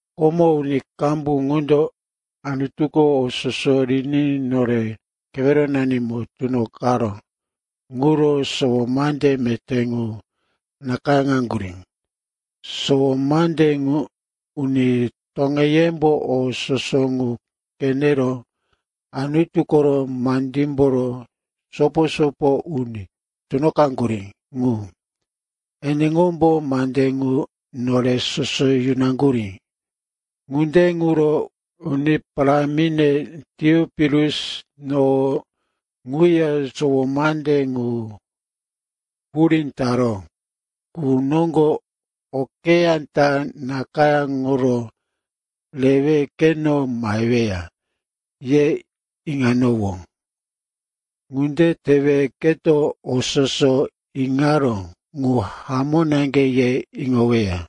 Komo uni qambu qundo Anutuko o soso riní nore keweronanimo tunoqaró ŋuro sowo mande meté ŋu nakayáŋaŋgurí. Sowo mande ŋu uni toŋeyembo o soso ŋu qenero Anutu koro mandímboro sopo-sopo uni tunoqaŋgurí ŋu, eneŋombo mande ŋu nore soso yimiraŋgurí. Ŋunde ŋuro, uni parámine Teopilus, no ŋuya sowo mande ŋu hurí taró qu noŋgo okeyá ta nakayáŋoro rewe keno maheweya, ye iŋanowó. Ŋunde tewe, keto o soso iŋaró ŋuko hamó naŋge, ye iŋoweya.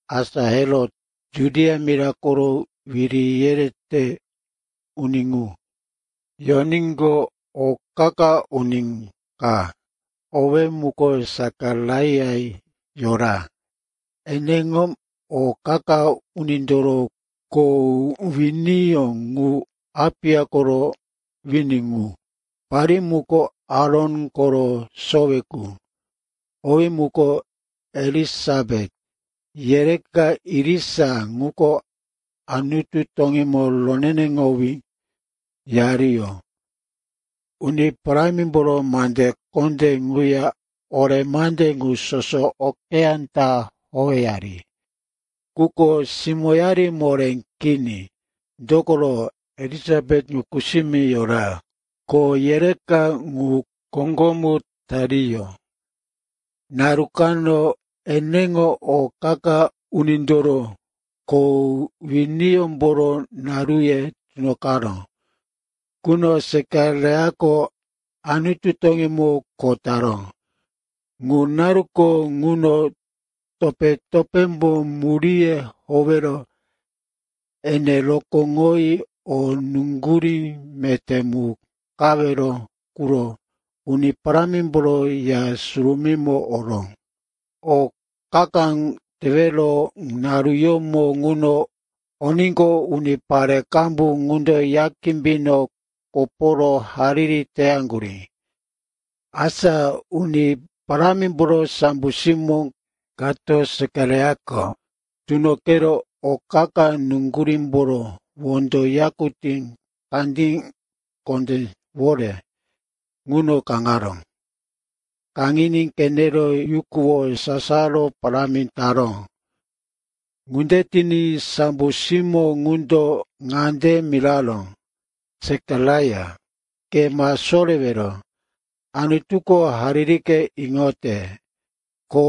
Asa Herot, Judia mira koro wiri yerete uni ŋu, yoníqo, o qa-qa uni ka owí muko Sekaraia yora. Eneŋo o qa-qa unindoro kho winiyó ŋuko Apiya koro wini ŋu. Parí muko Aron koro sowe qu, owí muko Elisapet. Yereka irisa ŋuko Anutu toŋímo roneneŋowí yariyó, Uni Parámimboro mande kondé ŋuya ore mande ŋu soso okeyá ta howeyari. Quko simóyari moré kini, dokoro Elisapet ŋu kusimi yora. Ko yereka ŋu koŋgomu tariyó. Naru kano eneŋo o qa-qa unindoro kho winiyómboro naruye tunoqaró quno Sekaraiako Anutu toŋímo kho taró. Ŋu naruko ŋuno topé-topémbo muríye howero ene rokóŋoyi o nuŋgurí meté mu qawero quro Uni Parámimboro Ya Surumímo oró. O qa-qa ŋu tewero naruyómo ŋuno oníqo, unipare qambu ŋundo Ya kimbino koporo hariri teyaŋgurí. Asa Uni Parámimboro sambo simó kato Sekaraiako tunoqero o qa-qa nuŋgurímboro wondo yakutí kandí kondéwore ŋuno kaŋaró. Kaŋiní qenero yukuwo sasaro parámi taró. Ŋunde tiní sambo simó ŋundo ŋande miraró, “Sekaraia, ke ma sorewero, Anutuko haririke iŋote. Ko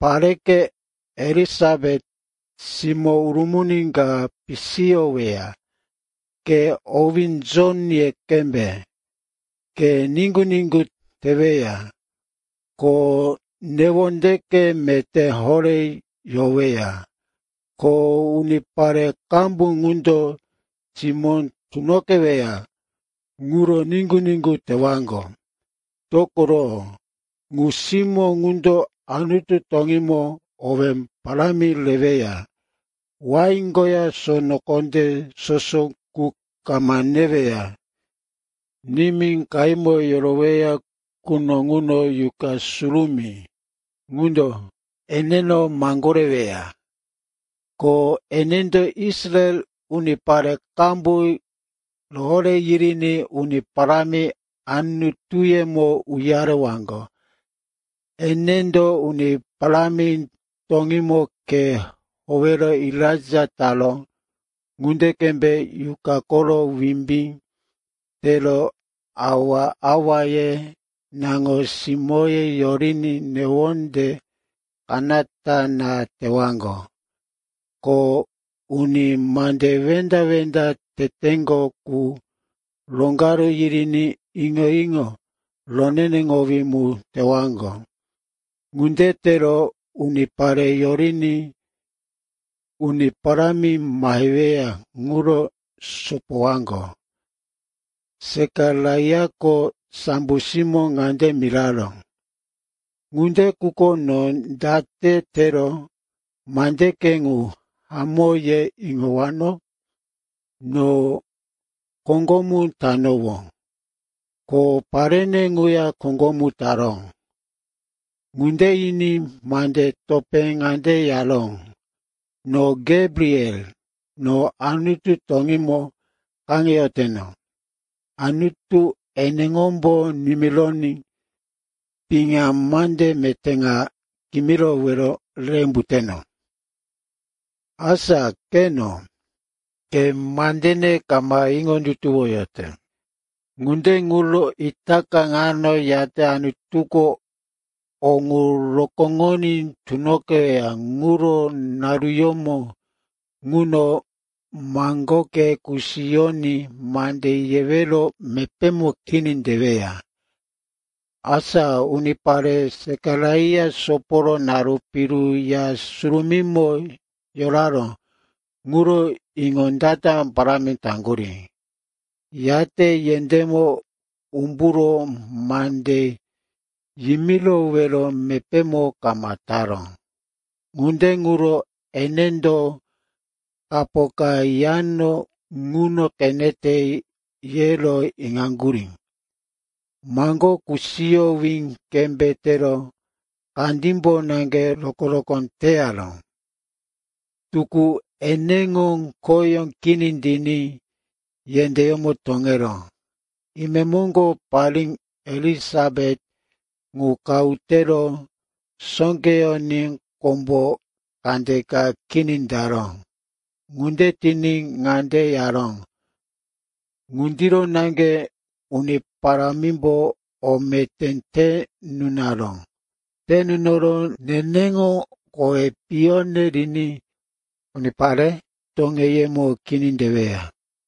pareke Elisapet simó urumuni ka pisiyoweya. Ke owí Jon ye qembe. Ke niŋgu-niŋgu teweya, ko newondeke meté horé yoweya. Ko unipare qambu qundo simó tunoqeweya ŋuro niŋgu-niŋgu tewaŋgo. Dokoro ŋu simó ŋuko Anutu toŋímo owé parámi reweya. Wain koya sono kondé soso ŋu kama neweya. Nimí qahímo yoroweya quno ŋuno Yuqa Surumí ŋundo eneno maŋgoreyoweya. Ko enendo Israel unipare qambu rohoré yiriní Uni Parámi, Anutuyemo uyarewaŋgo. Enendo Uni Parámi toŋímo khe howero Elaija taró ŋunde qembe Yuqa koro wimbí tero awa-awaye naŋo-simóye yoriní newonde kanata na tewaŋgo. Ko uni mande wenda-wenda teteŋgo qu roŋgaru yiriní iŋo-iŋo roneneŋowí mu tewaŋgo. Ŋunde tero unipare yoriní Uni Parámi maheweya ŋuro sopowaŋgo.” Sekaraiako sambo simó ŋande miraró, “Ŋunde quko no date tero mandeke ŋu hamó, ye iŋowano? No koŋgomu tanowó, ko parene ŋuya koŋgomu taró.” Ŋunde yiní mande topé ŋande yaró, “No Gebriel, no Anutu toŋímo kaŋeyoteno. Anutu eneŋombo nimironí piŋa mande meté ŋa kimirowero re umbuteno. Asa qeno, ke mandene kama iŋondutuwoyote. Ŋunde ŋuro itaka ŋano yate Anutuko o ŋu rokóŋoní tunoqeweya ŋuro naruyómo ŋuno maŋgoke kusiyoní mande yewero mepémo kini teweya.” Asa unipare Sekaraia soporo naru piru Ya Surumímo yoraró ŋuro iŋondata parámi taŋgurí. Yate yendémo umburo mande yimirowero mepémo kama taró. Ŋunde ŋuro, enendo kapo ka Yano ŋuno qenete, yero iŋaŋgurí. Maŋgó kusiyowí qembe tero kandímbo naŋge rokó-rokó teyaró. Tukú eneŋo khoyó kini tiníqo, yendéyómo toŋeró. Imemoŋgo parí Elisapet ŋu qahu tero sóqeyoní kombo kandeka kini taró. Ŋunde tiní ŋande yaró, “Ŋundiro naŋge Uni Parámimbo o meté te nunaró. Te nunoro neneŋo kowi piyone riní unipare toŋeyemo kini teweya.”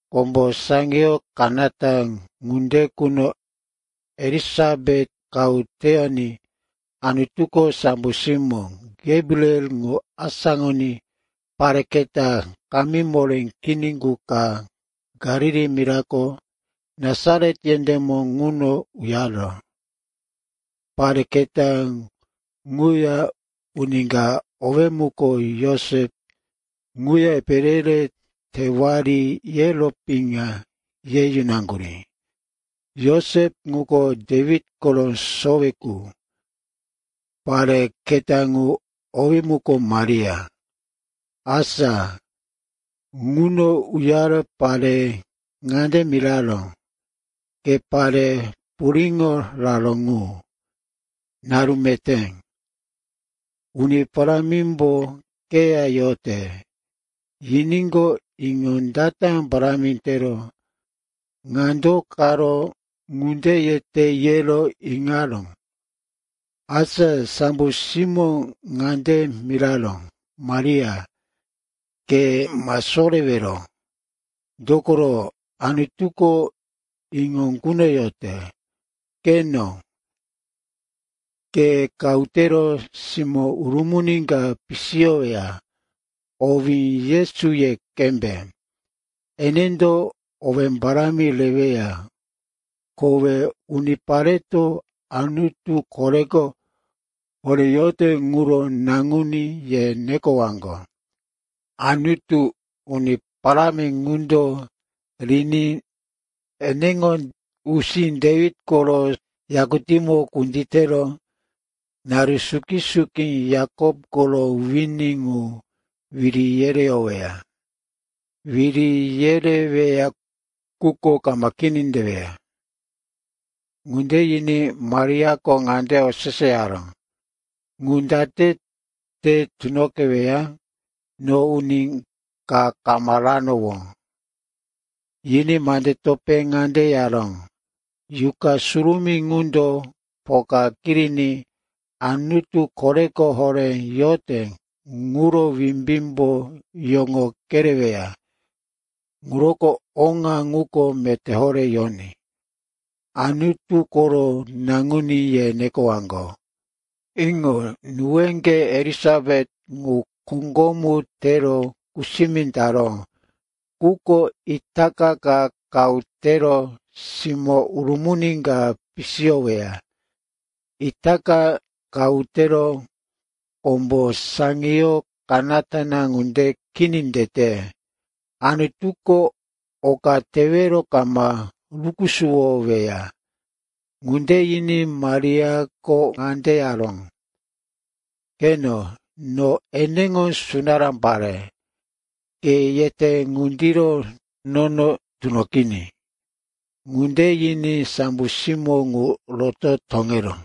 Kombo saŋiyo kanata ŋunde quno Elisapet qahu teyoní Anutuko sambo simó Gebriel ŋu asáŋoní pare keta kamí moré kini qu ka Galili mirako Nasaret yendémo ŋuno uyaró. Pare keta ŋuya uni ka, owí muko Josep, ŋuya epe re-re tewari, yero piŋa ye yunaŋgurí. Josep ŋuko Dewit koro sowe qu. Pare keta ŋu owí muko Maria. Asa ŋuno uyaro pare ŋande miraró, “Ke pare puriŋo raró ŋu, naru meté. Uni Parámimbo keya yote.” Yiníqo, iŋondata parámi tero, ŋa do karo ŋunde yete, yero iŋaró. Asa sambo simómbo ŋande miraró, “Maria, ke ma sorewero. Dokoro Anutuko iŋo kunoyote. Qeno, ke qahu tero simó urumuni ka pisiyoweya. Owí Yesu ye qembe. Enendo owé parámi reweya, kowe unipareto, Anutu Koreko Horé yote ŋuro Naŋuní, ye nekoyowaŋgo. Anutu, Uni Parámi ŋundo riní eneŋo usí Dewit koro yakutímo kunditero naru suki-suki Yakop koro wini ŋu wiri yereyoweya, wiri yereweya ŋuko kama kini teweya.” Ŋunde yiní Mariako ŋande oseseyaró, “Ŋu date te tunoqeweya? No uni ka kama ranowó.” Yiní mande topé ŋande yaró, “Yuqa Surumí ŋundo poka kiriní Anutu Koreko Horé yote ŋuro wimbímbo yoŋo kereweya. Ŋuroko oŋa ŋuko meté horé yoní, Anutu koro Naŋuní, ye nekowaŋgo. Iŋo, nuweŋge Elisapet ŋu koŋgomu tero kusimi taró, quko itaka ka qahu tero simó urumuni ka pisiyoweya. Itaka qahu tero kombo saŋiyo kanata ŋunde kini tete. Anutuko oka tewero kama rukusuwoweya!” Ŋunde yiní Mariako ŋande yaró, “Qeno, no eneŋo sunará pare. Ke yete ŋundiro nono tunoqiní.” Ŋunde yiní sambo simó ŋu roto toŋeró.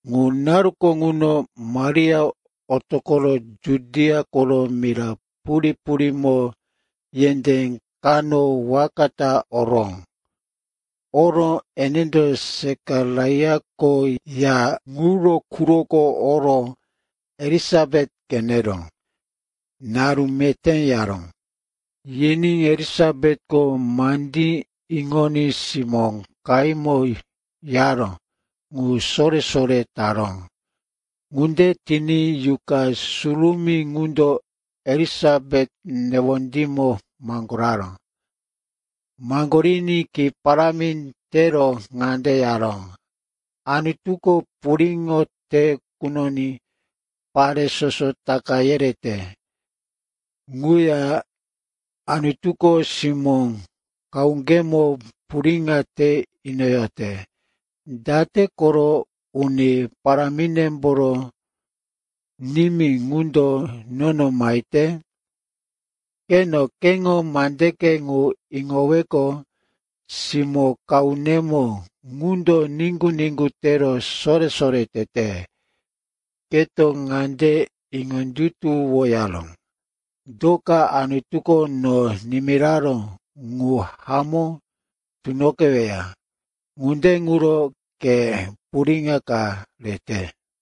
Ŋu naruko ŋuno Maria otoqoro Judia koro mira purí-purímo yendé kano waka ta oró. Oro enendo Sekaraiako ya ŋuro quroko oro Elisapet qenero, “Naru meté,” yaró. Yiní Elisapetko mandí iŋoní simó qahímo yaró ŋu sore-sore taró. Ŋunde tiní Yuqa Surumí ŋundo Elisapet newondímo maŋgoraró. Maŋgoriní ki parámi tero ŋande yaró, “Anutuko puriŋo te kunoní pare soso taka yereyote. Ŋuya Anutuko simó qahuŋgemo puriŋo te inoyote. Date koro Uni Paráminemboro nimí ŋundo nono mahete? Qeno, keŋo mandeke ŋu iŋoweqo, simó qahunemo ŋundo niŋgu-niŋgu tero sore-sore tete. Keto ŋande iŋondutuwoyaró, do ka Anutuko no nimiraró ŋu hamó tunoqeweya. Ŋunde ŋuro ke puriŋo ka rete.”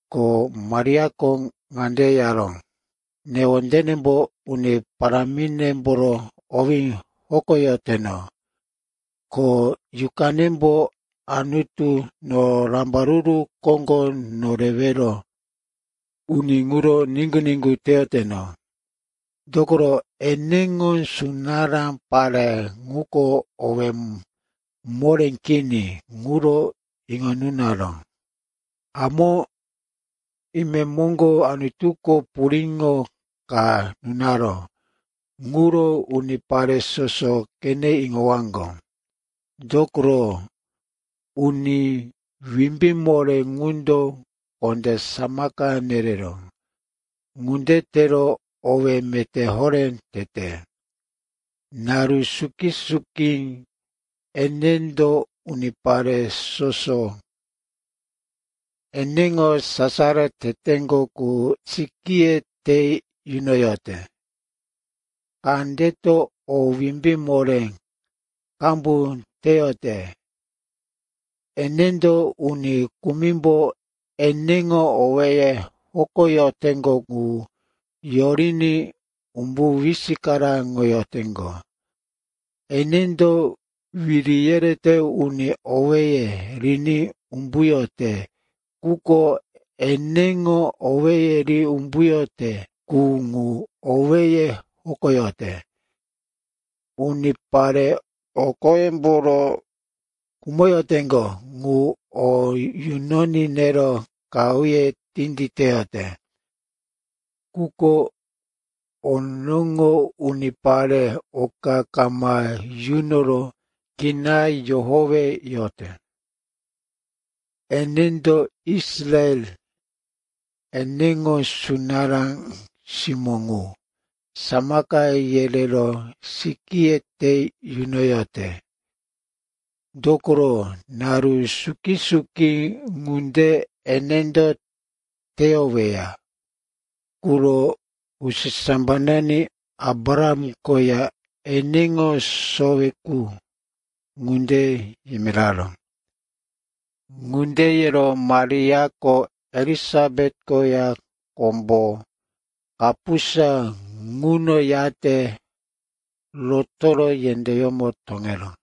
Ko Mariako ŋande yaró, “Newondenembo Uni Parámimboro owí hokoyoteno, ko yuqanembo Anutu, no Rambaruru Koŋgo Norewero Uni ŋuro niŋgu-niŋgu teyoteno, dokoro, eneŋo sunará pare ŋuko owí moré kini ŋuro iŋo nunaró. Hamó, imemoŋgo Anutuko puriŋo ka nunaró ŋuro unipare soso qene iŋowaŋgo, dokoro Uni Wimbí Moré ŋundo kondé samaka nereró. Ŋunde tero owí meté horé tete. Naru suki-suki enendo unipare soso eneŋo sasaro teteŋgo qu sikíye te yunoyote. Kandeto o wimbí moré qambu teyote. Enendo uni kumimbo eneŋo owéye hokoyoteŋgo ŋu yoriní umbu wisikaraŋoyoteŋgo. Enendo wiri yerete uni owéye riní umbuyote, quko eneŋo owéye ri umbuyote qu ŋu owéye hokoyote. Unipare o qoyemboro khumoyoteŋgo ŋu o yunoní nero qahuye tinditeyote, quko onoŋo unipare oka kama yunoro kina yohoweyote. Enendo Israel, eneŋo sunará simó ŋu, samaka yerero sikíye te yunoyote. Dokoro naru suki-suki ŋunde enendo teyoweya ŋuro usisambanani Abraham koya eneŋo sowe qu ŋunde yimiraró.” Ŋunde yero Mariako Elisapet koya kombo kapusa ŋuno yate rotoro yendéyómo toŋeró.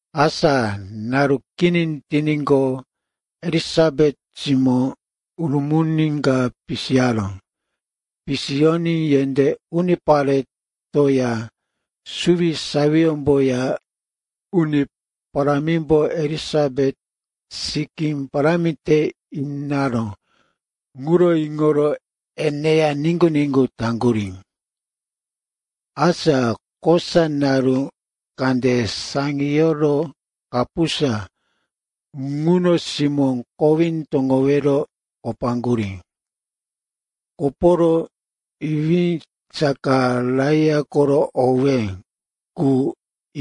Asa naru kini tiníqo, Elisapet simó urumuni ka pisiyaró. Pisiyoní yendé uniparetoya suwisawiyómboya Uni Parámimbo Elisapet sikí parámi te inaró ŋuro iŋoro eneya niŋgu-niŋgu taŋgurí. Asa kosa naru kande saŋiyoro kapusa ŋuno simó kowí toŋowero kopaŋgurí. Koporo, iwí Sekaraia koro owé qu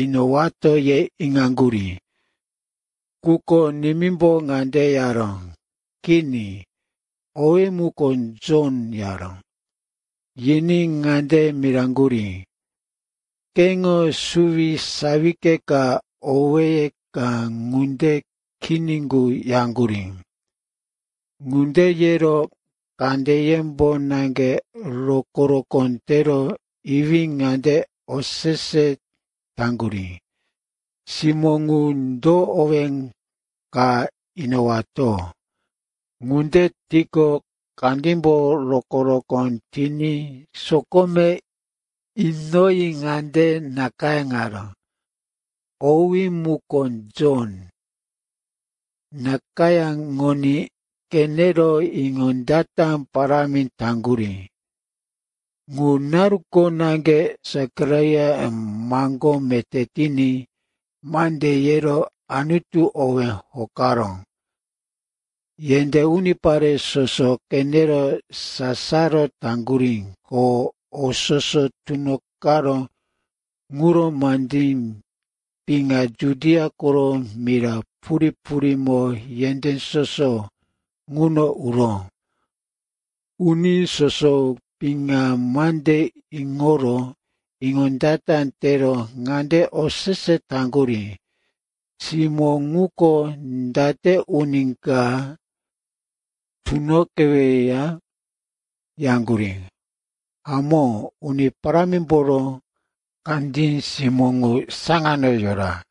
inowato, ye iŋaŋgurí. Quko nimímbo ŋande yaró, “Kini. Owí muko Jon,” yaró. Yiní ŋande miraŋgurí, “Keŋo suwisawike ka, owéye ka ŋunde kini qu,” yaŋgurí. Ŋunde yero kandeyembo naŋge rokó-rokó tero iwí ŋande osese taŋgurí, simó ŋu do owé ka inowato. Ŋunde tiqo, kandímbo rokó-rokó tiní sokome inoyi ŋande nakayáŋaró, “Owí muko Jon.” Nakayáŋoní qenero iŋondata parámi taŋgurí. Ŋu naruko naŋge Sekaraia maŋgó meté tiní mande yero Anutu owí hokaró. Yendé unipare soso qenero sasaro taŋgurí. Ko o soso tunoqaró ŋuro mande piŋa Judia koro mira purí-purímo yendé soso ŋuno uró. Uni soso piŋa mande iŋoro iŋondata tero ŋande osese taŋgurí, “Simó ŋuko, date uni ka tunoqeweya?” yaŋgurí. Hamó, Uni Parámimboro kandí simó ŋu saŋano yora.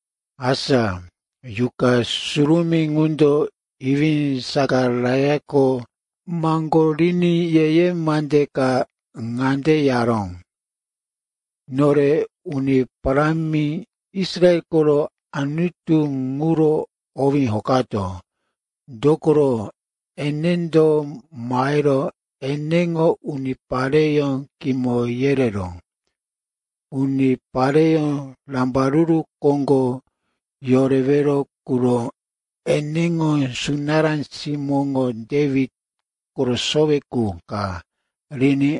Asa Yuqa Surumí ŋundo iwí Sekaraiako maŋgoriní ye-ye mande ka ŋande yaró, “Nore Uni Parámi, Israel koro Anutu ŋuro owí hokato. Dokoro enendo mahero eneŋo unipareyó kimo yerero unipare rambaruru koŋgo yorewero quro eneŋo sunará simóŋo Dewit koro sowe qu ka riní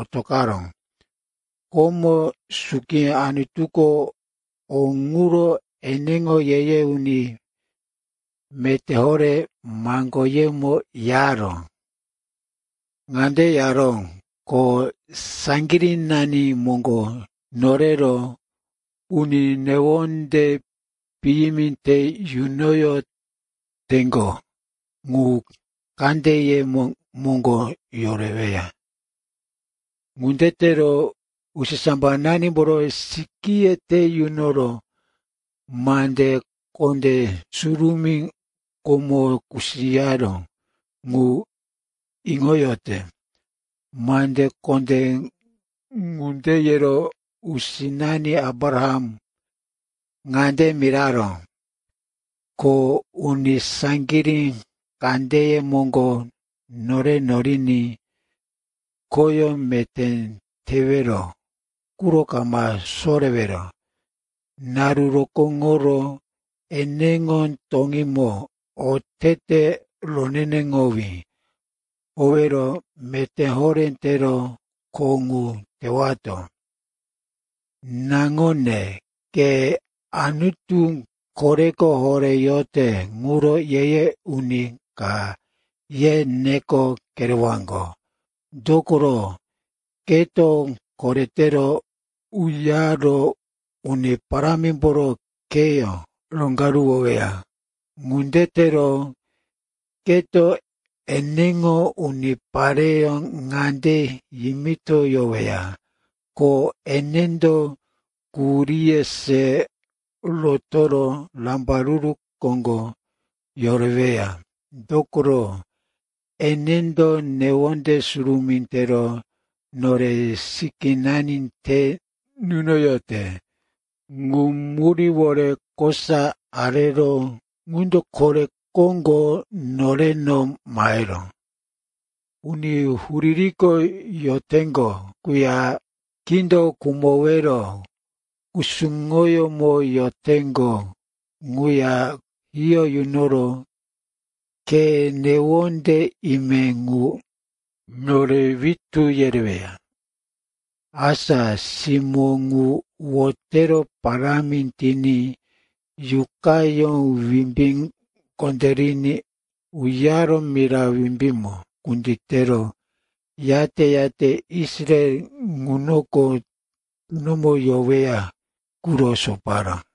otoqaró. Komo suki Anutuko o ŋuro eneŋo ye-ye uni meté horé maŋgoyemo yaró. Ŋande yaró, ko saŋgirínani moŋgo nore norero uni newonde piyimi te yunoyoteŋgo qu kandeye moŋgo yoreweya. Ŋunde tero usisambananimboro sikíye te yunoro mande kondé surumí komo kusiyaró ŋu iŋoyote. Mande kondé ŋunde yero usinani Abraham ŋande miraró, ko uni saŋgirí kandeye moŋgo nore noriní khoyó meté tewero quro kama sorewero naru rokóŋoro eneŋo toŋímo otete roneneŋowí howero meté horé tero kho ŋu tewato. Naŋone, ke Anutu Koreko Horé yote ŋuro ye-ye uni ka, ye neko kerewaŋgo. Dokoro keto koretero uyaro Uni Parámimboro kheyó roŋgaruwoweya. Ŋunde tero keto eneŋo unipareyó ŋande yimitoyoweya, ko enendo quhuríye se rotoro rambaruru koŋgo yoreweya. Dokoro enendo newonde surumí tero nore sikínani te nunoyote. Ŋu muríwore kosa areró ŋundo kore koŋgo noreno mahero uni huririko yoteŋgo quya kindo khumowero kusuŋoyómo yoteŋgo quya hiyó yunoro khe newonde ime qu nore witú yereweya.” Asa simó ŋu wotero parámi tiní yuqayó wimbí kondériní uyaro mira wimbímo kunditero, yate-yate Israel ŋunoko tunomo yoweya quro soparó.